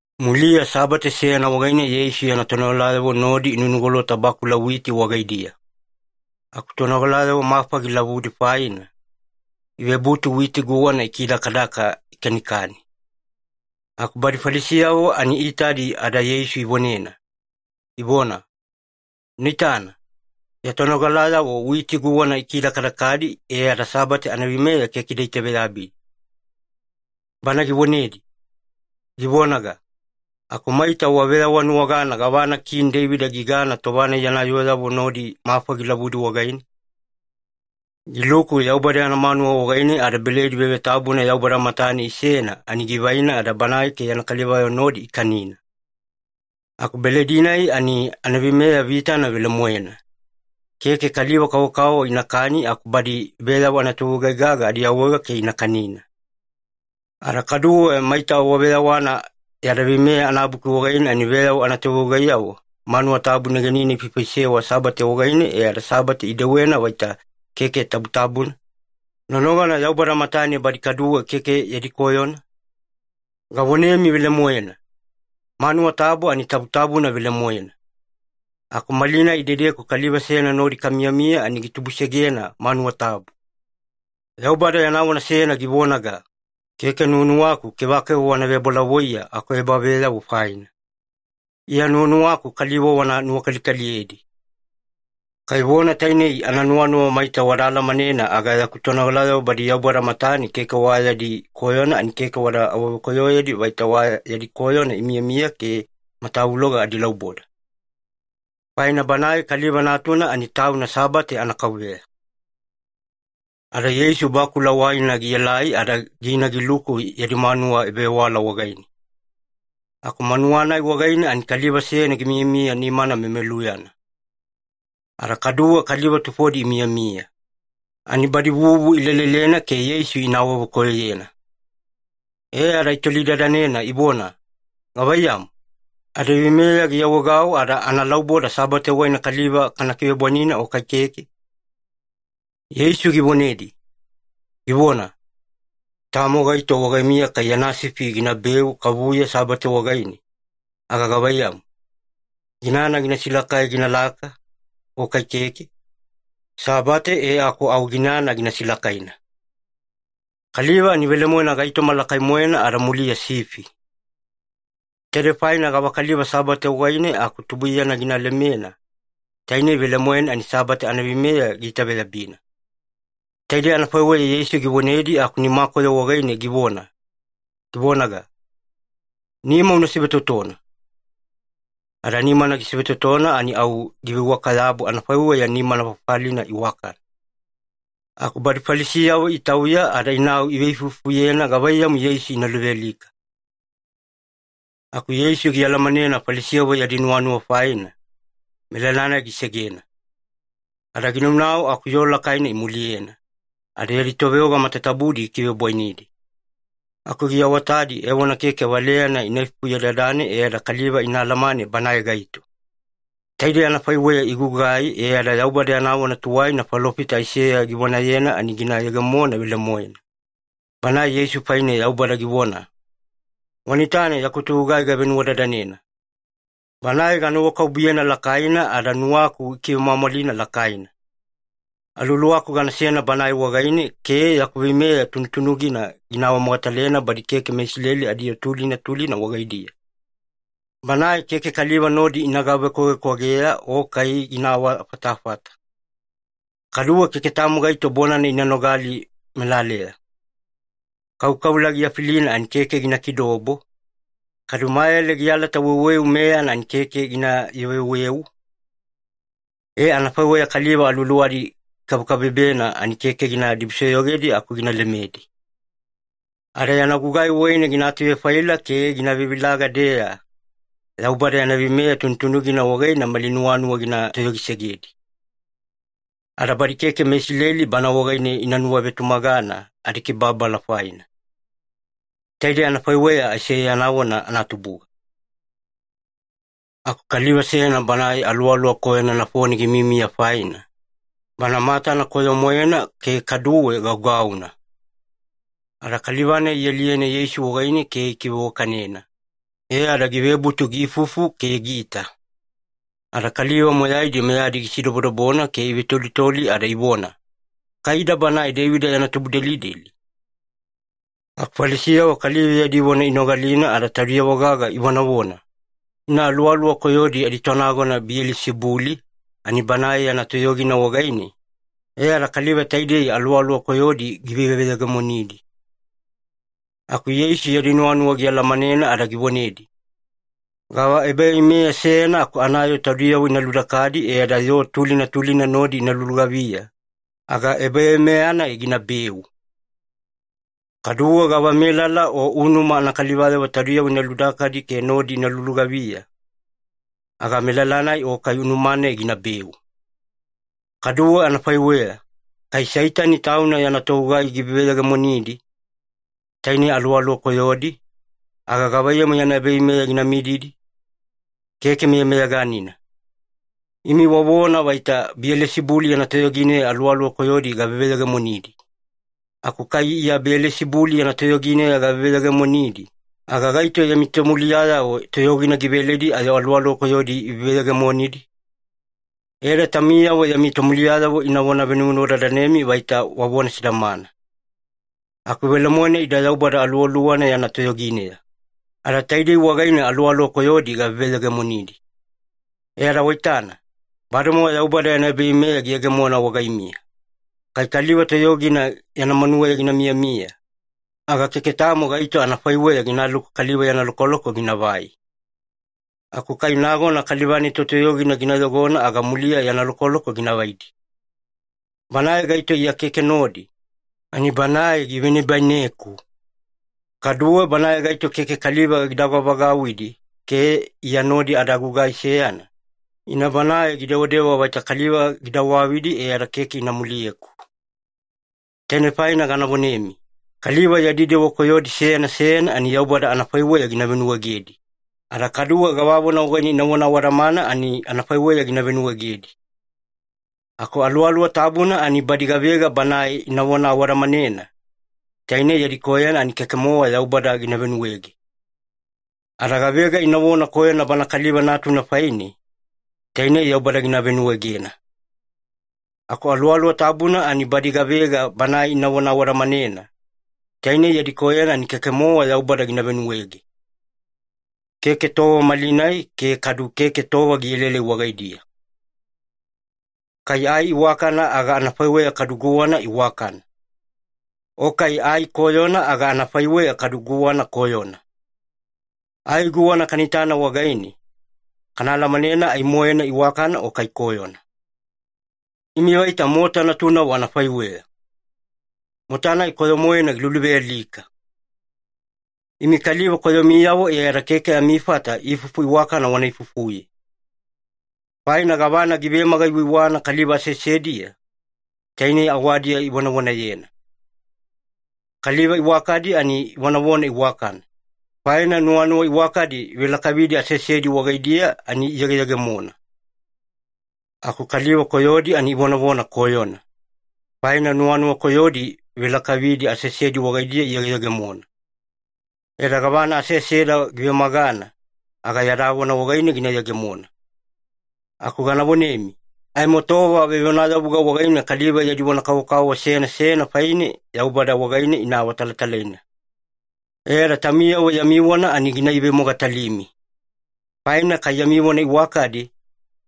Muliya Sabate seyana wagaine Yeisu yana tonogalayavo nodi inunugolota bakula witi wagaidiya. Aku tonogalayavo mafa gilavudi faina, ivebutu witi guwana ikidakadaka ikanikani. Aku badi Falisiyavo ani iitadi ada Yeisu ivonena, ivona, “Una itana, ya tonogalayavo witi guwana ikidakadakadi, e ada Sabate anaveimeya keke ida itaveyabi.” Bana givonedi, givonaga, “Aku maita waveyawanuwagana gavana Kini Deivida gigana tova-nai yana yooyavo nodi mafa gilavudi wagaine? Giluku Yaubada yana manuwa wagaine ada beledi vevetabuna Yaubada matane isena, ani givaina ada banae ke yana kalivayavo nodi ikanina. Aku beledi-nai ani anaveimeya vitana velemoena. Keke kaliva-kavokavovo inakani aku badi veyavo anatovegugai-gaga adiawaega ke ina kanina. Ada kaduwe maita waveyawana adaVeimeya anabuki wagaine, ani veyavo anatovegugaiyavo manuwa tabu negenine ifaifaisewa Sabate wagaine, e ada Sabate idewena vaita keke tabutabuna, nonogana Yaubada matane badi kaduwe keke yadi koyona? Gavonemi velemoena, manuwa tabu ani tabutabuna velemoena, aku malinai idedeku kaliva seyana nodi kamiyamiya ani gitubusegena manuwa tabu. Yaubada yana vona seyana givonaga, ‘Keke nuwanuwaku kevakeva wana vebolavoiye akuebaveyavo faina. Iya nuwanuwaku kaliva wana nuwakalikaliyedi.’ Kai vona tainei ananuwanuwa maita wada alamanena, aga yaku tonogalayavo badi Yaubada matane keke wa yadi koyona, ani keke wada awavekoyoyedi vaita wa yadi koyona imiyamiya ke matavuloga adilauboda. Faina Banae Kaliva Natuna ani Tauna Sabate anaKauveya.” Ada Yeisu bakula waina gielai, ada gina giluku yadi manuwa ebavewala wagaine. Aku manuwa-nai wagaine ani kaliva seyana gimiyamiya nimana memeluyana. Ada kaduwe kaliva tufodi imiyamiya, ani badi vuvu ilelelena ke Yeisu ina awavekoyoyena. E ada itolidadanena ivona, “Gavaiyamu, adaveimeya giawaegau ada analauboda Sabate wagaine kaliva kana kivebwainina o kai keke?” Yeisu givonedi, givona, “Tamo gaito wagaimiya kai yana sifi ginabeu kavuya Sabate wagaine, aga gavaiyamu, ginana gina silakai ginalaka o kai keke? Sabate e aku au ginana gina silakaina. Kaliva ani velemoena gaitoma lakai-moena ada muliya sifi. Taidei faina gavakaliva Sabate wagaine aku tubuiyana gina lemena, tainei velemoena ani Sabate anaveimeya giitaveyabina.” Taidei anafaiweya Yeisu givonedi aku nimakoyo wagaine givona, givonaga, “Nima una sivetotona.” Ada nimana gisivetotona, ani au giveiwaka-yabu anafaiweya nimana fafalina iwakana. Aku badi Falisiyavo itauya ada inau iveifuifufuyena gavaiyamu Yeisu ina luvealika. Aku Yeisu gialamanena Falisiyavo yadi nuwanuwa faina, melala-nai gisegena. Ada ginaunau aku yoo lakaina imuliyena, ada yadi toveoga matatabudi gikivebwainidi. Aku giawatadi evona keke valeyana ina ifufuyedadane e ada kaliva ina alamane Banae gaito. Taidei anafaiweya gigugai e ada Yaubada yana vona tuwaina falofita Aiseya givonayena, ani gina yegemona velemoena. Banae Yeisu faine Yaubada givona, “Wana itana yaku togugai gavenuwadadanena. Banae ganuwakabubuyena lakaina ada nuwaku gikivemwamwalina lakaina. Aluwaluwaku ganasena Banae wagaine, ke yaku veimeya tunutunugina gina awamogatalena badi keke meIsileli adiyoo tulina tulina wagaidiya. Banae keke kaliva nodi ina gavekwavekwageya o kai gina awafatafata, kadu keke tamo gaito bonana ina nogali melaleya. Kaukaula giafilina ani keke gina kidobo, kadu mayale gialata weuweu meyana ani keke gina yuveweu. E, anafaiweya kaliva aluwaluwadi ikabekabebena ani keke gina dibusoyogedi aku gina lemedi. Ada yana gugai wagaine gina atuvefaila ke gina vevilaga-deeya, Yaubada yana veimeya tunutunugina wagaine mali nuwanuwa gina toyogisegedi. Ada badi keke meIsileli Bana wagaine ina nuwavetumagana adikibababala faina.” Taidei anafaiweya Aiseya yana vona anatubuga. Aku kaliva seyana banae aluwaluwa koyona nafone gimiyamiya faina, bana matana koyo-moena ke kaduwe gaugauna. Ada kaliva-nai ialiyena Yeisu wagaine ke gikiveiwakanena, e ada givebutu giifufu ke giita. Ada kaliva moyaidi meyadi gisidobodobona ke ivetolitoli ada ivona, “Kai ida Banae Deivida yana tubudelideli?” Aku Falisiyavo kaliva yadi vona inogalina ada taudiyavo-gaga ivonavona, “Ina aluwaluwa koyodi aditonagona Biyelisibuli, ani banae yana toyogina wagaine e ada kaliva taidei aluwaluwa koyodi giveveyegemonidi.” Aku Yeisu yadi nuwanuwa gialamanena ada givonedi, “Gava ebaveimeya seyana aku anayoo taudiyavo ina ludakadi e ada yoo tulina tulina nodi ina lulugaviya, aga ebaveimeya-nai ginabeu. Kaduwe gavamelala o unuma anakalivayavo taudiyavo ina ludakadi ke nodi ina lulugaviya, aga melala-nai o kai unuma-nai ginabeu. Kaduwe anafaiweya, kai Seitani tauna yana togugai giveveyegemonidi, tainei aluwaluwa koyodi, aga gavaiyamu yana ebaveimeya gina mididi? Keke meyameyaganina. Imi wavona vaita Biyelisibuli yana toyogineya aluwaluwa koyodi gaveveyegemonidi. Aku kai Iya Biyelisibuli yana toyogineya gaveveyegemonidi, aga gaito yami tomuliyayavo toyogina giveledi ayo aluwaluwa koyodi iveveyegemonidi? E ada taumiyavo yami tomuliyayavo inavona venuvenuwadadanemi vaita wavona sidamana. Aku velemoena ida Yaubada Aluwaluwana yana toyogineya, ada taidei wagaine aluwaluwa koyodi gaveveyegemonidi. E ada waitana, bademowa Yaubada yana ebaveimeya giyegemona wagaimiya. Kai kaliva totoyogina yana manuweya gina miyamiya, aga keke tamo gaito anafaiweya ginaluku kaliva yana lokoloko ginavai. Aku kai nagona kaliva-nai totoyogina gina yogona, aga muliya yana lokoloko gina vaidi. Banae gaito Iya keke nodi, ani banae givenibaineku. Kaduwe banae gaito keke kaliva gida vagavagauwidi ke Iya nodi ada gugai seyana, ina banae gidewadewa vaita kaliva gida wavidi e ada keke ina muliyeku. Tainei faina gana vonemi, kaliva yadi dewa koyodi seyana seyana ani Yaubada anafaiweya gina venuwaegedi, ada kaduwe gavavona wagaine inavona awadamana ani anafaiweya gina venuwaegedi. Aku Aluwaluwa Tabuna ani badi gavega Banae inavona awadamanena, tainei yadi koyona ani keke-mowa Yaubada gina venuwaege. Ada gavega inavona koyona Bana Kaliva Natuna faine, tainei Yaubada gina venuwaegena. Aku Aluwaluwa Tabuna ani badi gavega Banae inavona awadamanena, tainei yadi koyona ani keke-mowa Yaubada gina venuwaege. Keke tova malinai ke kadu keke tova gielaelai wagaidiya. “Kai ai iwakana aga anafaiweya kadu guwana iwakana. O kai ai koyona aga anafaiweya kadu guwana koyona. Ai guwana kana itana wagaine, kana alamanena ai-moena iwakana o kai koyona. Imi vaita mota natunavo anafaiweya, mota-nai koyo-moena giluluvealika! Imi kaliva koyomiyavo e ada keke amifata ifufu iwakana wana ifufuye. Faina gavana givemaga-iwaiwana kaliva aseasediya, tainei awadiya ivonavonayena. Kaliva iwakadi ani ivonavona iwakana, faina nuwanuwa iwakadi ivelakavidi aseasedi wagaidiya ani iyegeyegemona. Aku kaliva koyodi ani ivonavona koyona, faina nuwanuwa koyodi ivelakavidi aseasedi wagaidiya iyegeyegemona. E ada gavana aseaseda givemagana, aga yada vona wagaine gina yegemona. Aku gana vonemi, aimo tova vevonayavuga wagaine kaliva yadi vona kavokavovo seyana seyana faine, Yaubada wagaine ina awatalatalaina. E ada taumiyavo yami vona ani gina ivemogatalimi. Faina kai yami vona iwakadi,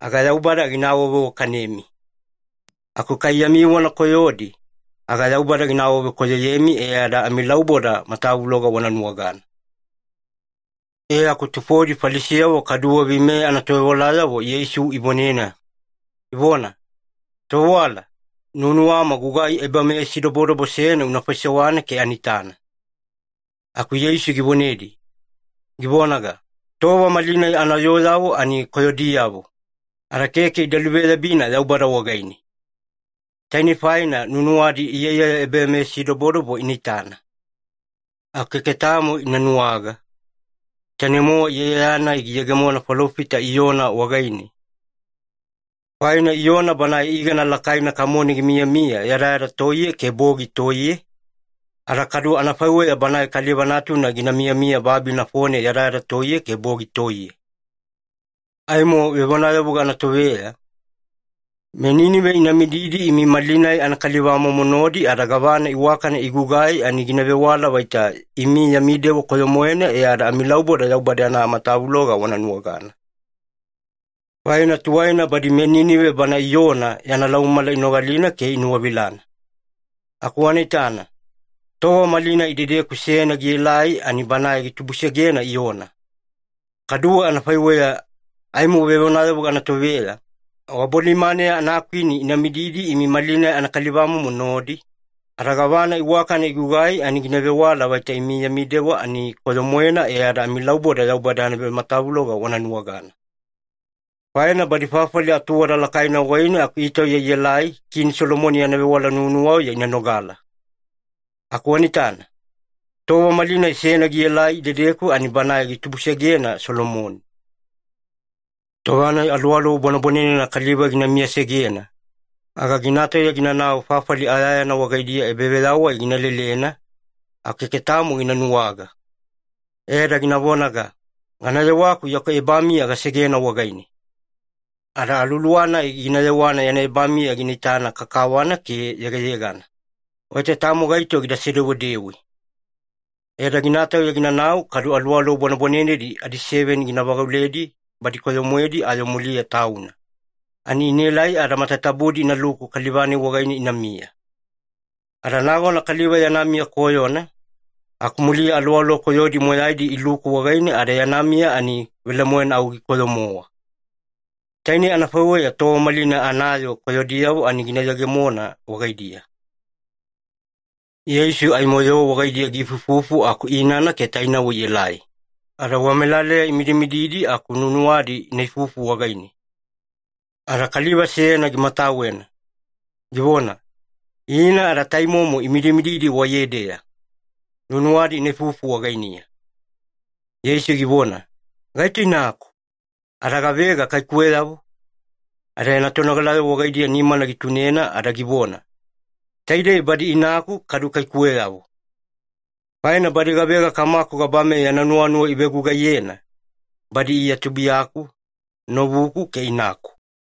aga Yaubada gina awaveiwakanemi. Aku kai yami vona koyodi, aga Yaubada gina awavekoyoyemi e ada amilauboda matavuloga wana nuwagana.” E aku tufodi Falisiyavo kaduwe veimeya anatovewalayavo Yeisu ivonena, ivona, “Tovewala, nuwanuwama gugai ebameyasidobodobo seyana una faisewana ke ana itana.” Aku Yeisu givonedi, givonaga, “Tova malinai anayooyavo ani koyodiyavo, ada keke ida luveyabina Yaubada wagaine. Tainei faina nuwanuwadi iyaiyaya ebameyasidobodobo ina itana. Aku keke tamo ina nuwaga, tainei-mowa iyaiyaya-nai giyegemona falofita Iyona wagaine. Faina Iyona banae igana lakaina kamone gimiyamiya yadayada toiye ke bogi toiye, ada kadu anafaiweya Banae Kaliva Natuna gina miyamiya babi nafone yadayada toiye ke bogi toiye. Aimo vevonayavuga anatoveya, meNinive ina mididi imi malinai anakalivamomo nodi, ada gavana iwakana igugai ani gina vewala vaita imi yami dewa koyo-moena, e ada amilauboda Yaubada yana matavuloga wana nuwagana. Faina tuwaina badi meNinive bana Iyona yana laumamala inogalina ke inuwavilana. Aku wana itana, tova malinai idedeku seyana gielai ani Banae gitubusegena Iyona. Kaduwe anafaiweya, aimo vevonayavuga anatoveya, wabolimaneya anakwini ina mididi imi malinai anakalivamomo nodi, ada gavana iwakana igugai ani gina vewala vaita imi yami dewa ani koyo-moena, e ada amilauboda Yaubada yana matavuloga wana nuwagana. Faina badi fafali atuwada lakaina wagaine aku itauya ielai Kini Solomoni yana vewala nuwanuwauya ina nogala. Aku wana itana, tova malinai seyana gielai idedeku ani Banae gitubusegena Solomoni. “Tova-nai aluwaluwa bwanebwanenena kaliva gina miyasegena, aga gina tauya ginanau fafali ayayana wagaidiya ebaveyawai gina lelena, aku keke tamo gina nuwaga. E ada gina vonaga, ‘Gana yewaku yaku ebamiya gasegena wagaine.’ Ada aluwaluwa-nai gina yewana yana ebamiya gina itana kakawana ke yegayegana, vaita tamo gaito gida sedewedewe. E ada gina tauya ginanau, kadu aluwaluwa bwanebwanenedi adiseveni gina vagauledi badi koyo-moedi ayo muliya tauna. Ani inaelai ada matatabudi inaluku kaliva-nai wagaine inamiya. Ada nagona kaliva yana miya koyona, aku muliya aluwaluwa koyodi moyaidi iluku wagaine ada yana miya ani velemoena au gikoyo-mowa. Tainei anafaiweya tova malinai anayoo koyodiyavo ani gina yegemona wagaidiya.” Yeisu aimo yoo wagaidiya giifuifufu aku inana ke tainavo ielai. Ada wamelaleya imidimididi aku nuwanuwadi ina ifufu wagaine. Ada kaliva seyana gimatawena, givona, “Ina ada taimomo imidimididi waiyedeya. Nuwanuwadi ina ifufu wagainiya.” Yeisu givona, “Gaito inaku? Ada gavega kaikuweyavo?” Ada yana tonogalayavo wagaidiya nimana gitunena ada givona, “Taidei badi inaku kadu kaikuweyavo. Faina badi gavega Kamaku gabameya yana nuwanuwa ivegugaiyena, badi Iya tubuiyaku, novuku, ke inaku.”